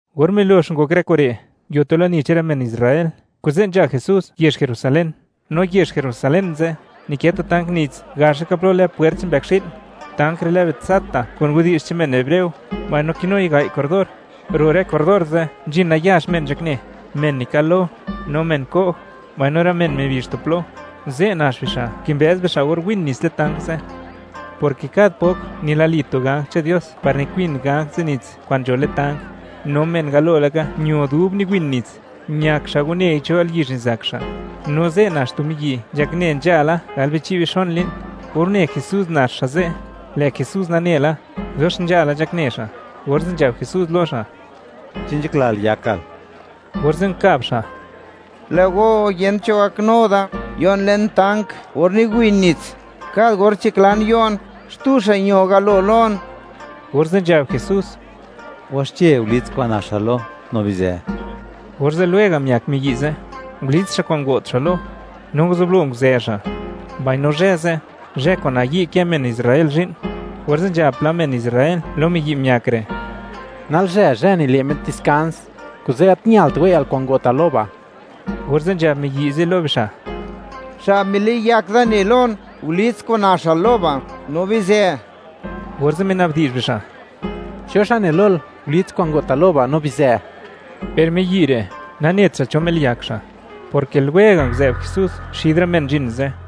Or milox ngok rë kure', nguio tu lani che'n rë men Israel, kuze' nzha Jesús yezh Jerusalén. No yezh Jerusalén ze', nikë tu tank nits gax laka plo lë Puert che'n mbëkxi'l; tank re' lë Betzata kun widi'zh che'n men hebreo, mbaino kinui gai' corredor. Ro' rë corredor ze' nzhin nayax men nzhakne, men nikal-lo, no men ko'j, mbaino rë men mibizh tu plo; ze' nax bixa' kimbëz bixa' or win nits le'n tank ze', porke kad pok nilali tu ganj che'n Dios par nikwin ganj ze' nits kwa'n nzho le'n tank, no men galo laka ño dub niwin nits, ñak xa' wanei cho yalyizh nizak xa'. No ze' nax tu miyi' nzhakne nzhala galbichi' bixon li'n. Or une Jesús nax xa' ze', lë' Jesús nane la, dox nzhala nzhakne xa', orze' nzhab Jesús lo xa': ―¿Chi nzhaklal yakal? Orze' nkab xa': ―Lë' go, yent cho gaknu da yo'n le'n tank or niwin nits, kad or nzhaklan yo'n, xtu xa' ño galo lon. Orze' nzhab Jesús: ―Waxche, gulits kwa'n naxal lo, no bizë. Orze' lwega' miak miyi' ze', ngulits xa' kwa'n ngo't xa' lo, no nguzublo nguzë xa', mbaino zhë ze', zhë kwa'n nayi' kë men Israel zhi'n. Orze' nzhab pla men Israel lo miyi' miak re': ―Nalzhë, zhë nile' met diskans, kuze' gat ñalt wei'yal kwa'n ngo'tal lo ba'. Orze' nzhab miyi' ze' lo bixa': ―Xa' miliyak da, ne lon: “Gulits kwa'n naxal lo ba', no bizë.” Orze' mina'bdi'zh bixa': ―¿Cho xa' ne lol: “Gulits kwa'n ngo'tal lo ba', no bizë”? Per miyi' re' nanet xa' cho miliyak xa', porke lwega' nguzë'b Jesús xid rë men nzhin ze'.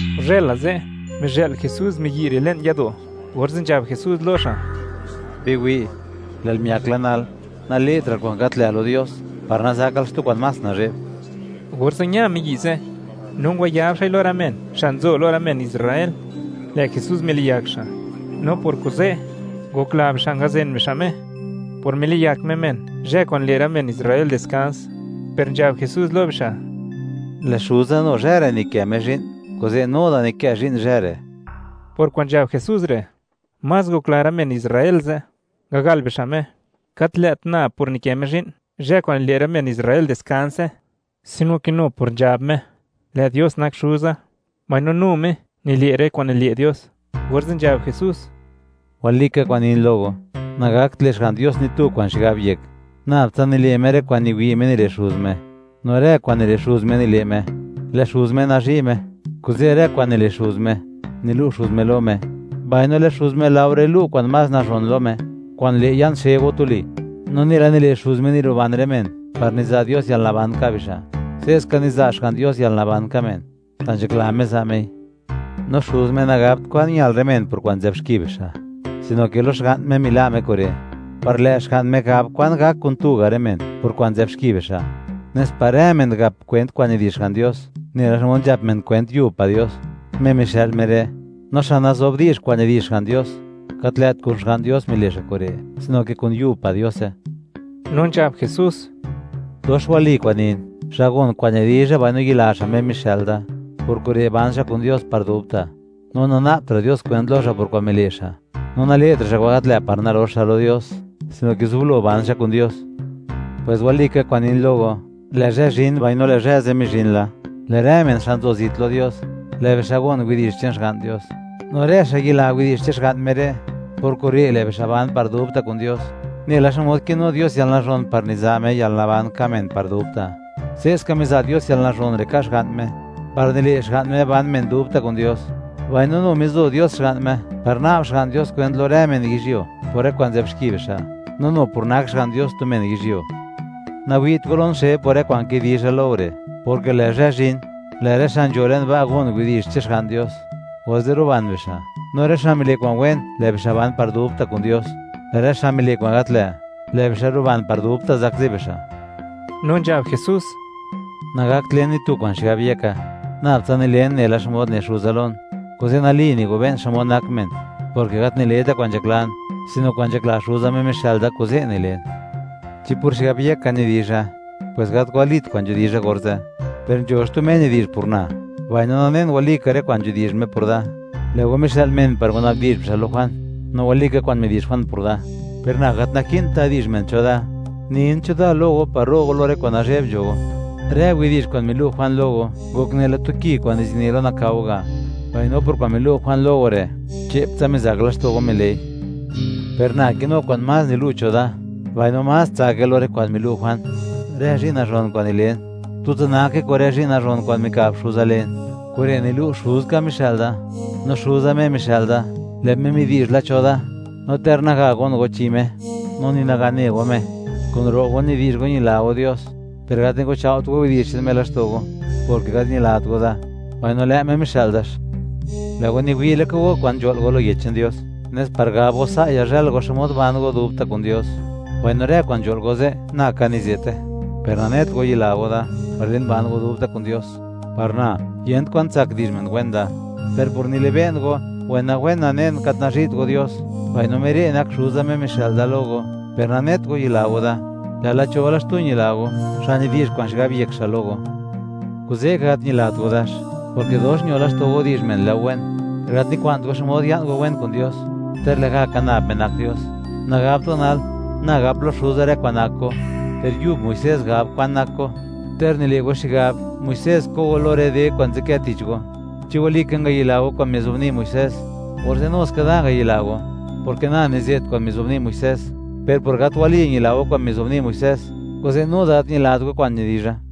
Guzhëla ze', mizhë'l Jesús miyi' re' le'n yado', orze' nzhab Jesús lo xa': ―Biwi', lë'l miak la nal, nale'tra'l kwa'n gat lë' lo Dios, par nazakal xtu kwa'n más nazhe'b. Orze' ña miyi' ze', no ngwayab xa'i lo rë men xa' nzo lo rë men Israel, lë' Jesús miliyak xa'. No por kuze', ngokla bixa' ngazen bixa' Me, por miliyak Me men zhë kwa'n nile' rë men Israel diskans, per nzhab Jesús lo bixa': ―Lë' Xuza nu zhë re' nikë Me zhi'n, kuze' nu da nikë zhi'n zhë re'. Por kwa'n nzhab Jesús re', más ngokla rë men Israel ze', ngagal bixa' Me, gat lë't nab por nikë Me zhi'n zhë kwa'n nile' rë men Israel diskanse, sino ke nu por nzhab Me: “Lë' Dios nak Xuza”, mbaino nu Me nile' rë kwa'n nile' Dios. Orze' nzhab Jesús: ―Walika kwa'n nin lo go, nagakt le' Xga'n Dios ni tu kwa'n xigab yek, nab tsa nile' Me rë kwa'n niwi' Me nile' Xuz Me, no rë kwa'n nile' Xuz Me nile' Me. Lë' Xuz Me nazhi' Me, kuze' rë kwa'n nile' Xuz Me, nilu' Xuz Me lo Me, mbaino lë' Xuz Me laore lu' kwa'n más nazhon lo Me, kwa'n le' ya'n xe go tuli, no nela nile' Xuz Me niruban rë men, par niza' Dios yalnaban ka' bixa', se'ska niza' Xga'n Dios yalnaban ka' men, xa' nzhakla Me za' Mei, no Xuz Me nagabt kwan ñal rë men por kwa'n nzë'b xki bixa', sino ke lo Xga'n Me mila' Me kure', par lë' Xga'n Me gab kwan gak kun tu ga' rë men por kwa'n nzë'b xki bixa', nes par rë men gap kwent kwa'n nidi'zh Xga'n Dios nela xmod nzhap men kwent yub pa' Dios, Me mixë'l Me re'. No xa' nazo'b di'zh kwa'n nidi'zh Xga'n Dios, gat lë't kun Xga'n Dios mile' xa' kure' sino ke kun yub pa' Diose. No nzhab Jesús: —Dox wali kwa'n nin, xa' gon kwa'n nidizha, mbaino yila xa' Me mixë'l da, por kure' ban xa' kun Dios par dubta'. No nana'btra' Dios kwent lo xa' por kwa'n mile' xa'. No nale'tra' xa' kwa'n gat lë' par nalox xa' lo Dios, sino ke zublo ban xa' kun Dios. Pwes walika kwa'n nin lo go, lë' zhë zhin, mbaino lë' zhë ze' mizhin la, lë' rë men xa' nzo zit lo Dios, lë' bixa' gon widi'zh che'n Xga'n Dios, no rë xa' yila widi'zh che'n Xga'n Me re', por kure' lë' bixa' ban par dubta' kun Dios. Nela xmod kinu Dios yalnazhon par niza' Me yalnaban ka' men par dubta', se'ska miza' Dios yalnazhon re' ka' Xga'n Me, par nile' Xga'n Me ban men dubta' kun Dios. Mbaino nu mizo Dios Xga'n Me par na'b Xga'n Dios kwent lo rë men yizhyuo por rë kwa'n nzë'b xki bixa', no nu por nak Xga'n Dios tu men yizhyuo. Nawi't go lon xe por rë kwa'n kidizha lo go re', porke lë' zhë zhin, lë' rë xa' nzho le'n ba' gon widi'zh che'n Xga'n Dios, orze' ruban bixa', no rë xa' mile' kwa'n wen, lë' bixa' ban par dubta' kun Dios; per rë xa' mile' kwa'n gat lë', lë' bixa' ruban par dubta' zakzi bixa'. No nzhab Jesús: ―Nagakt len ni tu kwa'n xigab yeka, nab tsa nilen nela xmod ne Xuza lon. Kuze' nali nigobe'n xmod nak men, porke gat nile'ta' kwa'n nzhaklan, sino kwa'n nzhakla Xuza, Me mixë'l da, kuze' nilen. Chi por xigab yeka nidizha, pues gat walit kwa'n nidizha orze', per nzho xtu Me nidi'zh por na, mbaino nanen, walika rë kwa'n nidi'zh Me por da. Lë' go mixë'l men par ngwana'bdi'zh bixa' lo Juan, no walika kwa'n midi'zh Juan por da. Per na gat naki'nt da di'zh men cho da; nin cho da lo go par ro' go lo rë kwa'n nazhe'b nzho go. Rë widi'zh kwa'n milu' Juan lo go ngok nela tu ki kwa'n nizini lo nakao ga'; mbaino por kwa'n milu' Juan lo go re', che'ptsa mizak laxto' go mile'i. Per na kinu kwa'n más nilu' cho da, mbaino más tsake lo rë kwa'n milu' Juan: Rë zhi'n nazhon kwa'n nilen, tutsa nake kun rë zhi'n nazhon kwa'n mika'b Xuza len. Kure' nilu', Xuzka mixë'l da. No Xuza Me mixë'l da, lë' Me midi'zh la cho da, no ter naga gon go chi Me, no ni naga ne go Me. Kun ro' go nidi'zh go ñila go Dios, per gat niguchao't go widi'zh che'n Me laxto' go, porke gat ñilat go da, mbaino lë' Me mixë'l dax. Lë' go niwi' laka go kwa'n nzho'l go lo Widi'zh che'n Dios, nes par gab go, sa' yazhël go xmod ban go dubta' kun Dios, mbaino rë kwa'n nzho'l go ze', na ka nize'te; per nanet go yila go da par len ban go dubta' kun Dios. Par na, yent kwan tsak di'zh men wen da, per por nilibe'n go, wenawen nanen, gat nazhi't go Dios. Mbaino Me re' nak Xuza, Me mixë'l da lo go, per nanet go yila go da; lë'la cho la xtu ñila go, xa' nidi'zh kwa'n xigab yek xa' lo go. ¡Kuze' ka, gat ñila go dax!, porke dox ño laxto' go di'zh men lë' go wen; per gat nikwa'nt go xmod ya'n go wen kun Dios, ter lë'gaka nab Me nak Dios. Nagabt go nal, na gap lo Xuza rë kwa'n nak go. Per yub Muisés gab kwan nak go, ter nile' go xigab, Muisés ko' go lo rë de kwa'n nzadkë tich go. Chi walika ngayila go kwa'n mizobni' Muisés, orze' nu ska da ngayila go, porke na nize't kwa'n mizobni' Muisés, per por gat wali ñila go kwa'n mizobni' Muisés, kuze' nu da, gat ñilat go kwa'n nidizha.